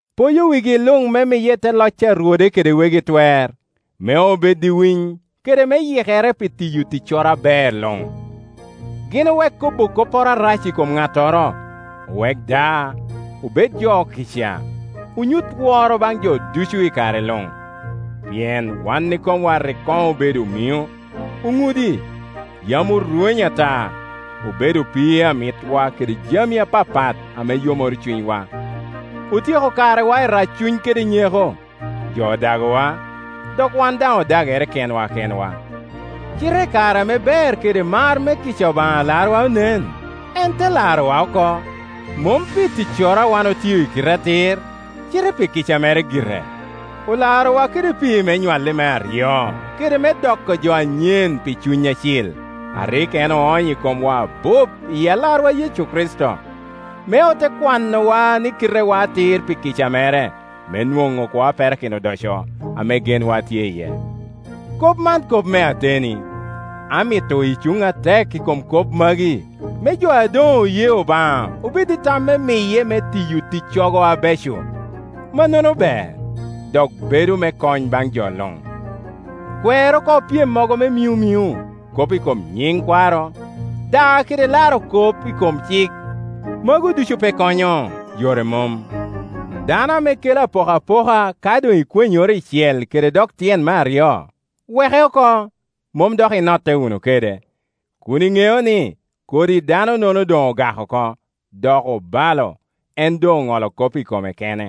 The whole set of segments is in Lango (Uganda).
Poyo wigi luŋ me miye i te loc a rwode kede wegi twer, me bedo i winy, kede me yikere pi tiyo ticcoro aber luŋ. Gin owek kobo kopporo arac i kom ŋattoro, owek da, obed jo okica, onyut woro baŋ jo ducu i kare luŋ. Pien wan ikomwa rik koŋ obedo omino, oŋudi, yam orwenyo ata, obedo opii a mitwa kede jami apapat ame yomoro cunywa. Otyeko karewa i raccuny kede nyeko, jo odagowa, dok wan daŋ odagere kenwa kenwa. Cite i kare ame ber kede mar me kica, Obaŋa Alarwa onen, en te larowa oko, mom pi ticcoro a wan otio i kite atir, cite pi kica mere gire. Olarowa kede pii me nywalle me aryo kede me doko jo anyen pi Cuny Acil, a rik en oonyo i komwa abup i Alarwa Yecu Kricito, me ote kwanowa ni kitewa atir pi kica mere, me onwoŋ kwo a perakino odoco, ame genwa tye iye. Kop man kop me ateni. Amito icuŋ atek i kom kop magi, me jo a doŋ oye Obaŋa obed i tam me miye me tiyo ticcogo abeco; mannono ber, dok bedo me kony baŋ jo luŋ. Kwer oko pyemmogo me minomino, kop i kom nyiŋ kwaro, daa kede laro kop i kom cik; magu ducu pe konyo, yore mom. Dano ame kela apoka poka ka doŋ ikwenyoro icel kede dok tyen me aryo, weke oko, mom dok inotte wunu kede, kun iŋeo ni, kodi danonono doŋ ogak oko, dok obalo, en doŋ oŋolo kop i kome kene.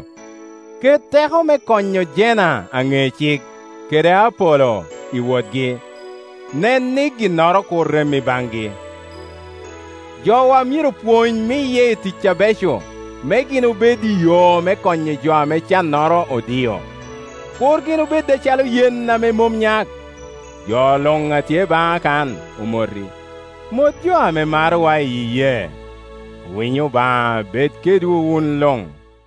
Kor. 16.12Ket teko me konyo Jena aŋe cik, kede Apolo i wotgi; nen ni ginnoro kur rem i baŋgi. Jowa myero pwony miye i tic abeco, me gin obed i yo me konyo jo ame cannoro odio; kur gin obed acalo yen a mom nyak. Jo luŋ a tye baŋa kan omoti. Mot jo a marowa i iyee. Winyo Obaŋa bed kedwu wun luŋ.